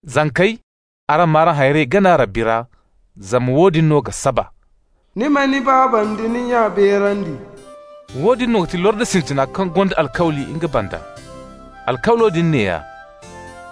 Zankey, araŋ m'araŋ hayrey gana Rabbi ra zama woodin no ga saba. «Ni ma ni baaba nda ni nya beerandi.» Woodin no ga ti lordi sintina kaŋ gonda alkawli nga banda. Alkawlo din neeya: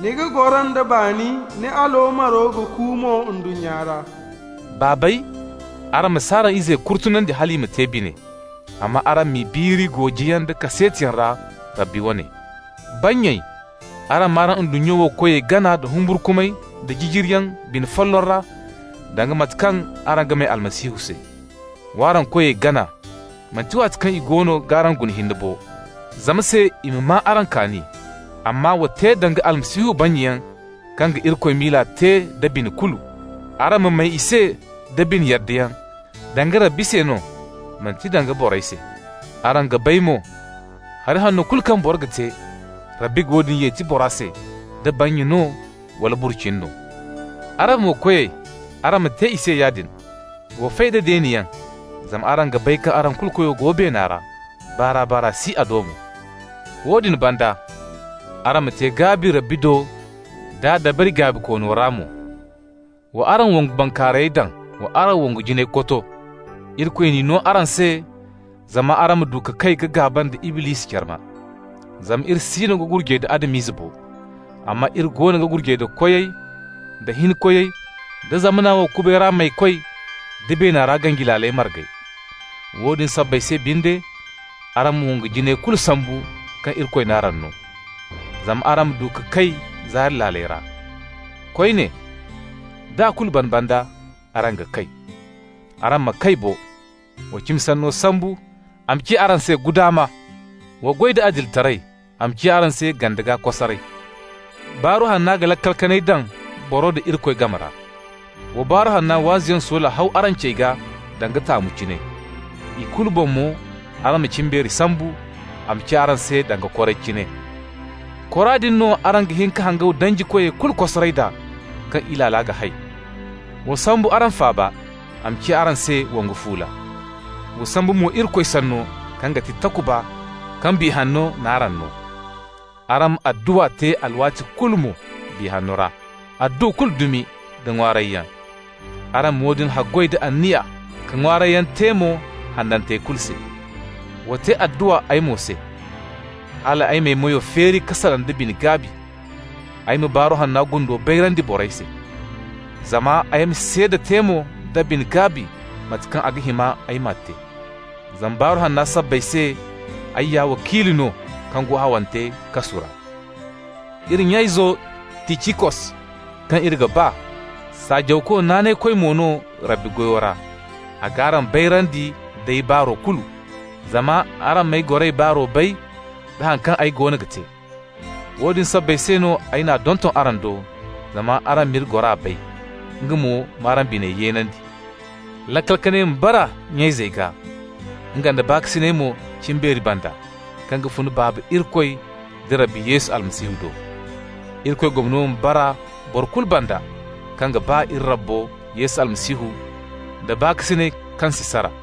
«Ni ga goro nda baani, ni aloomaro ga ku mo ndunnya ra.» Baabey, araŋ mo ma si araŋ izey kurtunandi hal i ma te bine, amma araŋ m'i biiri goojiyaŋ da kaseetiyaŋ ra, Rabbi wane. Bannyey, araŋ m'araŋ ndunnya wo koyey gana nda humburkumay da jijiriyaŋ bine folloŋ ra, danga mate kaŋ araŋ ga may Almasihu se. Wa araŋ koyey gana, manti waati kaŋ i goono g'araŋ guna hinne bo, zama se i ma maa araŋ kaani. Amma wa te danga Almasihu bannyayaŋ kaŋ ga Irikoy miila te da bine kulu. Araŋ ma may i se da bine yaddayaŋ, danga Rabbi se no, manti danga borey se. Araŋ ga bay mo, hari hanno kulu kaŋ boro ga te, Rabbi ga woodin yeti bora se, da bannya no wala burcini no. Araŋ mo koyey, araŋ ma te i se yaadin. Wa fay da deeniyaŋ, zama araŋ ga bay kaŋ araŋ kulu koyo go beena ra. Baar'a-baar'a si a do mo. Woodin banda, araŋ ma te gaabi Rabbi do d'a dabari gaabikoono ra mo. Wa araŋ wongu bankaarayey daŋ, wa araŋ wongu jinayey koto. Irikoy n'i no araŋ se zama araŋ ma du ka kay ka gaaba nda Iblisi carma. Zama iri siino ga gurjay da Adam-izey bo, amma iri goono ga gurjay da koyey, da hinkoyey, da zamana wo kubay ra maykoy, da beena ra ganji laaley margey. Woodin sabbay se binde, araŋ ma wongu jinayey kulu sambu kaŋ Irikoy n'araŋ no, zama araŋ ma du ka kay zaari laaley ra. Koyne, d'a kulu ban banda, araŋ ga kay. Araŋ ma kay bo! Wa cimi sanno sambu, a ma ciya araŋ se guddama. Wa goy da adilitaray, a ma ciya araŋ se gande gaa kosaray. Baaru Hanna ga laakal kanay daŋ boro nda Irikoy game ra. Wa Baaru Hanna waazuyaŋ soola haw araŋ cey gaa danga taamu cine. I kulu boŋ mo, araŋ ma cimbeeri sambu, a ma ciya araŋ se danga koray cine. Kora din no araŋ ga hin ka hangaw danjikoy kulu kosaray d'a kaŋ Ilaala ga hay. Wa sambu araŋ faaba, a ma ciya araŋ se wongu fuula. Wa sambu mo Irikoy Sanno kaŋ ga ti takuba kaŋ Biya Hanno n'araŋ no. Araŋ ma adduwa te alwaati kulu mo Biya Hanno ra, adduwa kulu dumi da ŋwaarayyaŋ. Araŋ ma woodin haggoy da anniya ka ŋwaarayyaŋ te mo hanantey kulu se. Wa te adduwa ay mo se, hal ay m'ay meyo feeri ka salaŋ da bine-gaabi, ay ma Baaru Hanna gundo bayrandi borey se. Zama ay ma seeda te mo da bine-gaabi mate kaŋ a ga hima ay ma te. Zama Baaru Hanna sabbay se ay ya wakiilu no kaŋ go hawante kasu ra. Iri nya-izo Ticikos, kaŋ iri ga ba, saajawko naanaykoy mo no Rabbi goyo ra, a g'araŋ bayrandi d'ay baaru kulu, zama araŋ m'ay goray baaro bay, da haŋ kaŋ ay goono ga te. Woodin sabbay se no ay n'a donton araŋ do, zama araŋ m'iri gora bay, nga mo m'araŋ biney yeenandi. Laakal kanay ma bara nya-izey gaa, nga nda baakasinay mo cimbeeri banda, kaŋ ga fun Baaba Irikoy da Rabbi Yesu Almasihu do. Irikoy gomno ma bara boro kulu banda kaŋ ga ba iri Rabbo Yesu Almasihu da baakasinay kaŋ si sara.